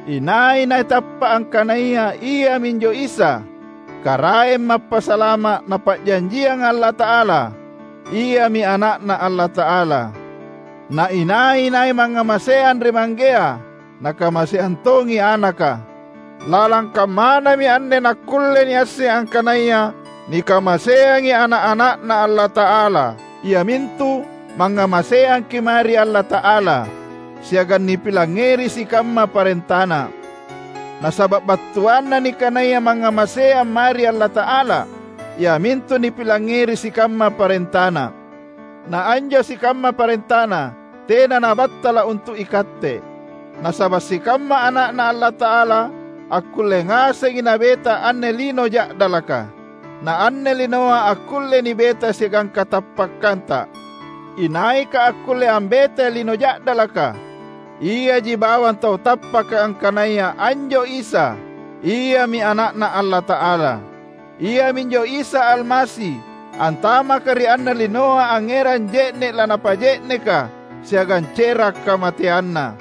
Inai-nai tappa’ angkanaya iaminjo Isa, Karaeng Mappasalama’ Napa’janjianga Allata’ala, iami Ana’Na Allata’ala. Na inai-nai mangngamaseang ri Manggea, nakamaseang tongi Anaka. Lalang kammanami anne nakkulle niasseng angkanaya nikamaseangi ana’-ana’Na Allata’ala, iamintu: mangngamaseangki’ mae ri Allata’ala, siagang nipilangngeri sikamma parentaNa. Nasaba’ battuanna nikanaya mangngamaseang mae ri Allata’ala, iamintu nipilangngeri sikamma parentaNa. Na anjo sikamma parentaNa tena nabattala’ untu’ ikatte; nasaba’ sikamma ana’Na Allata’ala akkulle ngasengi nabeta anne lino ja’dalaka. Na anne linoa akkullei nibeta siagang katappakkanta. Inaika akkulle ambetai lino ja’dalaka? Iaji bawang tau tappaka angkanaya anjo Isa, Iami Ana’Na Allata’ala. Iaminjo Isa Almasi, antamaka ri anne linoa angngerang je’ne’ lanapa’je’neka siagang cera’ kamateanNa.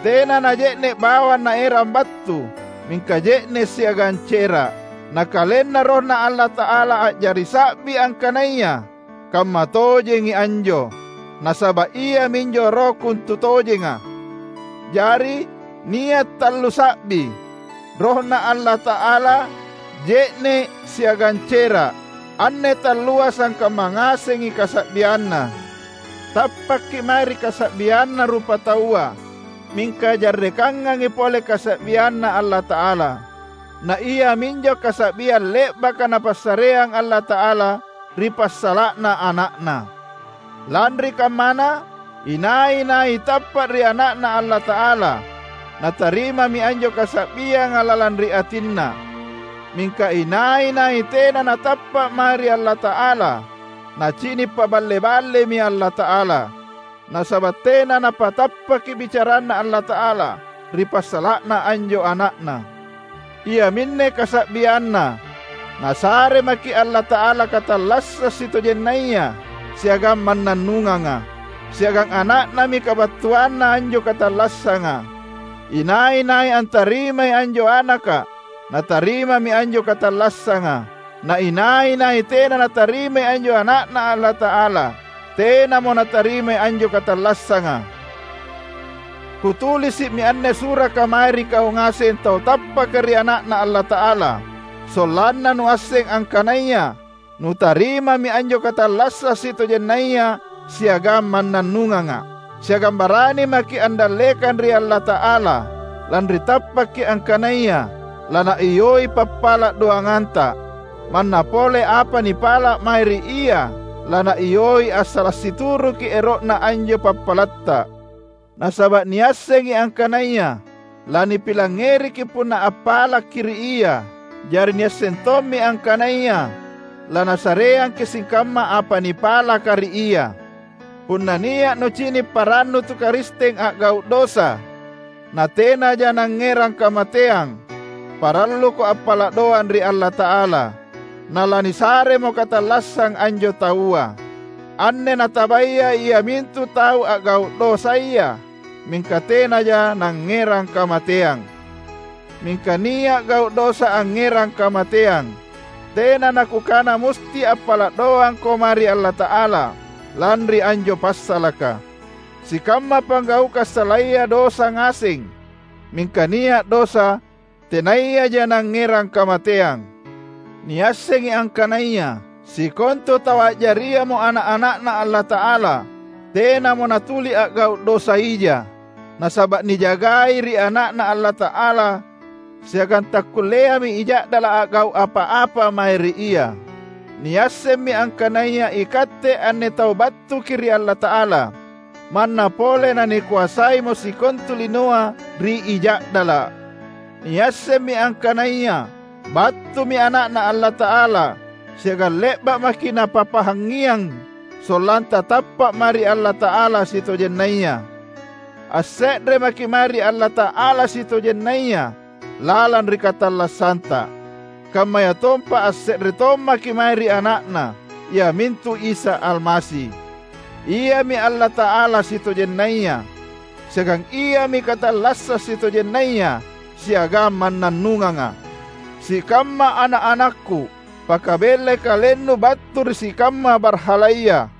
Tena naje’ne’ bawang Naerang battu, mingka je’ne’ siagang cera’. Na KalenNa RohNa Allata’ala a’jari sa’bi angkanaya kammatojengi anjo; nasaba’ iaminjo Roh kontutojenga. Jari, nia’ tallu sa’bi: RohNa Allata’ala, je’ne’, siagang cera’; anne tallua sangkamma ngasengi kasa’bianNa. Tappakki’ mae ri kasa’bianna rupataua, mingka jarrekangangi pole kasa’bianNa Allata’ala. Na iaminjo kasa’biang le’baka Napassareang Allata’ala ri passala’na Ana’Na. Lanri kammana, inai-nai tappa’ ri Ana’Na Allata’ala, natarimami anjo kasa’bianga lalang ri atinna; mingka inai-nai tena natappa’ mae ri Allata’ala, nacini’ paballe-ballemi Allata’ala, nasaba’ tena napatappaki bicaranNa Allata’ala ri passala’na anjo Ana’Na. Iaminne kasa’bianna: Nasare maki’ Allata’ala katallassang sitojennaya siagang mannannunganga, siagang Ana’Nami kabattuanna anjo katallassanga. Inai-nai antarimai anjo Anaka, natarimami anjo katallassanga; na inai-nai tena natarimai anjo Ana’Na Allata’ala, tenamo natarimai anjo katallassanga. Kutulisi’mi anne suraka mae ri kau ngaseng tau tappaka ri Ana’Na Allata’ala, sollanna nuasseng angkanaya nutarimami anjo katallassang sitojennaya siagang mannannunganga. Siagang barani maki’ andallekang ri Allata’ala, lanri tappakki’ angkanaya laNaiyoi pappala’ doanganta; manna pole apa nipala’ mae ri Ia laNaiyoi assala’ situruki ero’Na anjo pappalatta. Nasaba’ niassengi angkanaya lanipilangngeriki’ punna appalakki’ ri Ia, jari niasseng tommi angkanaya laNasareangki’ sikamma apa nipalaka ri Ia. Punna nia’ nucini’ parannu tu Karisteng a’gau’ dosa natenaja nangngerang kamateang, paralluko appala’ doang ri Allata’ala; nalanisaremo katallassang anjo taua. Anne natabaya iamintu tau a’gau’ dosaya, mingka tenaja nangngerang kamateang. Mingka nia’ gau’ dosa angngerang kamateang; tena nakukana musti appala’ doangko mae ri Allata’ala lanri anjo passalaka. Sikamma panggaukang salaya dosa ngaseng, mingka nia’ dosa tenayaja nangngerang kamateang. Niassengi angkanaya sikontu tau a’jariamo ana’-ana’Na Allata’ala, tenamo natuli a’gau’ dosa ija; nasaba’ nijagai ri Ana’Na Allata’ala siagang takkulleami I Ja’dala’ a’gau’ apa-apa mae ri ia. Niassemmi angkanaya ikatte anne tau battuki’ ri Allata’ala, manna pole nanikoasaimo sikontu linoa ri I Ja’dala’. Niassemmi angkanaya battumi Ana’Na Allata’ala siagang le’ba’ maki’ Napapahangngiang sollanta tappa’ mae ri Allata’ala sitojennaya. Asse’re maki’ mae ri Allata’ala sitojennaya lalang ri katallassanta, kammayatompa asse’re tommaki’ mae ri Ana’Na, iamintu Isa Almasi. Iami Allata’ala sitojennaya, siagang Iami katallassang sitojennaya siagang mannannunganga. Sikamma ana’-anakku, pakabellai kalennu battu ri sikamma barhalaya!